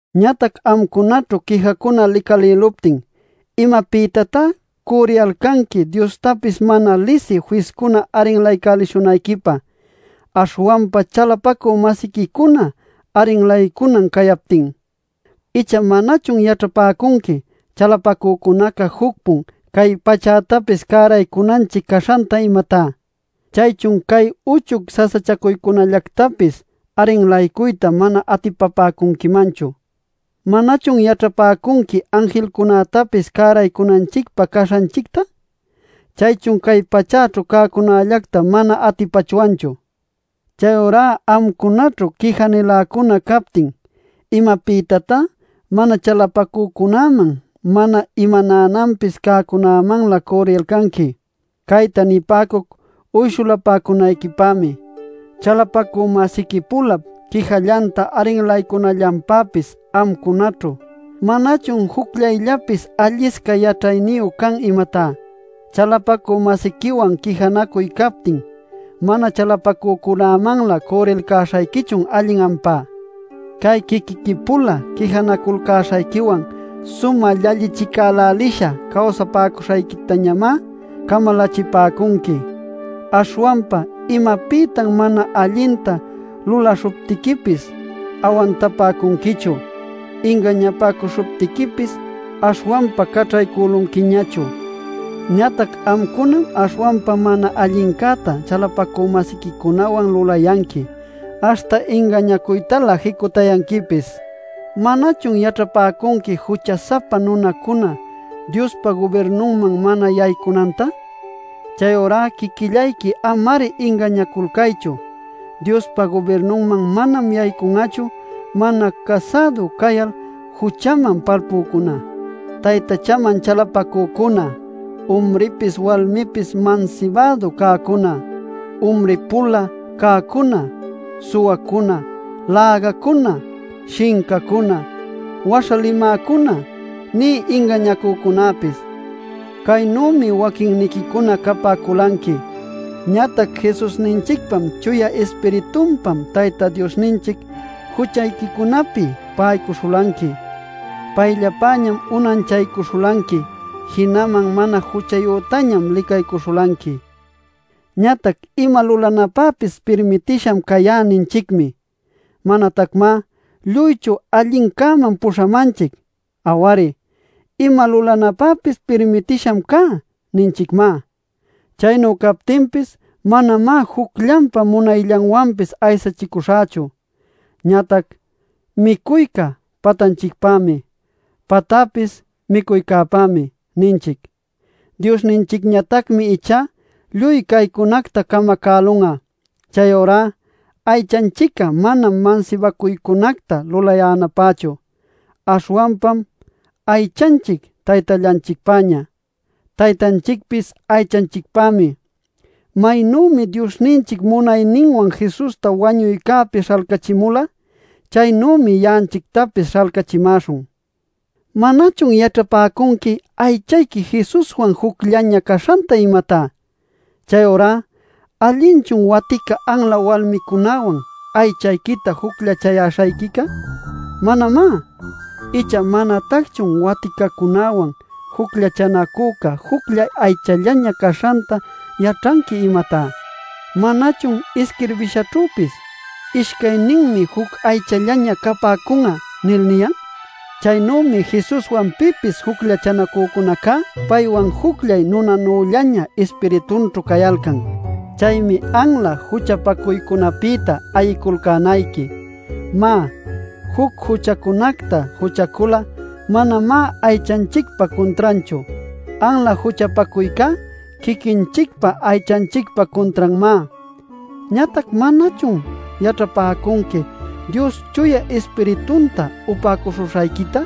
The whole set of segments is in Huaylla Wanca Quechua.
Ñatac amcunaćhu quijacuna licalïluptin ¡¿imapïtatá cürriyalcanqui Diostapis mana lisï fiscuna arrinlaycälishunayquipä, aśhwanpa chalapacü-masiquicuna arrinlaycunan cayaptin?! Icha ¿manachun yaćhapäcunqui chalapacücunaca juc-pun cay pachätapis cäraycunanchic caśhanta, imatá? ¿Chaychun cay uchuy sasachacuycunällactapis arrinlaycuyta mana atipapäcunquimanchu? ¿Manachun yaćhapäcunqui anjilcunätapis cäraycunanchicpä caśhanchicta? ¿Chaychun cay pachäćhu cäcunällacta mana atipachwanchu? Chayurá amcunaćhu quija-niläcuna captin ¿imapïtatá mana chalapacücunäman mana imanänanpis cäcunämanlä cürriyalcanqui? Cayta nipäcuc uyshulapäcunayquipämi. Chalapacü-masiqui-pulap quijallanta arrinlaycunallanpäpis amcunaćhu ¿manachun jucllayllapis allisca yaćhayniyu can, imatá? Chalapacü-masiquiwan quijanacuy captin ¿mana chalapacücunämanlä cürrilcäśhayquichun allin ampá? Cay quiquiqui-pula quijanacuyalcäśhayquiwan sumä llallichicälälisha cawsapäcuśhayquitañamá camalächipäcunqui. Aśhwanpa ¿imapïtan mana allinta luläśhuptiquipis awantapäcunquichu; ingañapäcuśhuptiquipis aśhwanpa caćhaycülunquiñachu? Ñatac amcunam aśhwanpa mana allincäta chalapacü-masiquicunawan lulayanqui, aśhta ingañacuytalä jicutayanquipis. ¿Manachun yaćhapäcunqui jucha-sapa nunacuna Diospa gubirnunman mana yaycunanta? Chayurá quiquillayqui ama-ari ingañaculcaychu: Diospa gubirnunman manam yaycun'achu mana casädu cayal juchaman palpücuna, taytachaman chalapacücuna, umripis walmipis mansibädu cäcuna, umri-pula cäcuna, suwacuna, lägacuna, shincacuna, waśha limäcuna, nï ingañacücunäpis. Caynümi waquinniquicuna capäculanqui. Ñatac Jesusninchicpam Chuya Ispiritupam Tayta Diosninchic juchayquicunapi pa'aycuśhulanqui, payllapäñam unanchaycuśhulanqui, jinaman mana juchayütañam licaycuśhulanqui. Ñatac “Ima lulanäpäpis pirmitisham cayá” ninchicmi. Manatacmá lluychu allincäman puśhamanchic. Aw-ari, “Ima lulanäpäpis pirmitisham cá” ninchicmá. Chaynu captinpis manamá jucllanpa munayllanwanpis aysachicuśhächu. Ñatac: “micuyca patanchicpämi; patapis micuycäpämi” ninchic. Diosninchicñatacmi ichá lluy caycunacta camacälun'a. Chayurá aychanchic'a manam mansibacuycunacta lulayänapächu, aśhwanpam aychanchic Taytallanchicpäña, Taytanchicpis aychanchicpämi. Maynümi Diosninchic munayninwan Jesusta wañuycäpi śhalcachimula, chaynümi ya'anchictapis śhalcachimäśhun. ¿Manachun yaćhapäcunqui aychayqui Jesuswan jucllaña caśhanta, imatá? Chayurá ¿allinchun watica anla walmicunawan aychayquita jucllachayäśhayquica? Manamá. Icha ¿manatacchun waticacunäwan jucllachanacüca jucllay aychallaña caśhanta yaćhanqui, imatá? ¿Manachun isquirbishaćhüpis: “Ishcayninmi juc aychallaña capäcun'a” nil niyan? Chaynümi Jesuswan pipis jucllachacücunacá paywan jucllay nunanüllaña ispiritunćhu cayalcan. Chaymi anla juchapacuycunapïta ayiculcänayqui. Má, juc juchacunacta juchacul'a manamá aychanchicpa cuntranchu. Anla juchapacuycá quiquinchicpa aychanchicpa cuntranmá. Ñatac ¿manachun yaćhapäcunqui Dios Chuya Ispiritunta upäcuśhuśhayquita,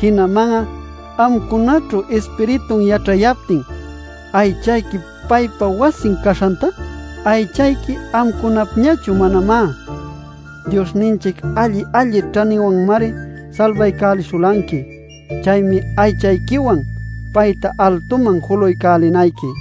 jinaman'a amcunaćhu Ispiritun yaćhayaptin, aychayqui paypa wasin caśhanta? Aychayqui amcunapñachu manamá. Diosninchic alli-alli ćhaniyüwanmari salbaycälishulanqui. Chaymi aychayquiwan payta altuman julaycälinayqui.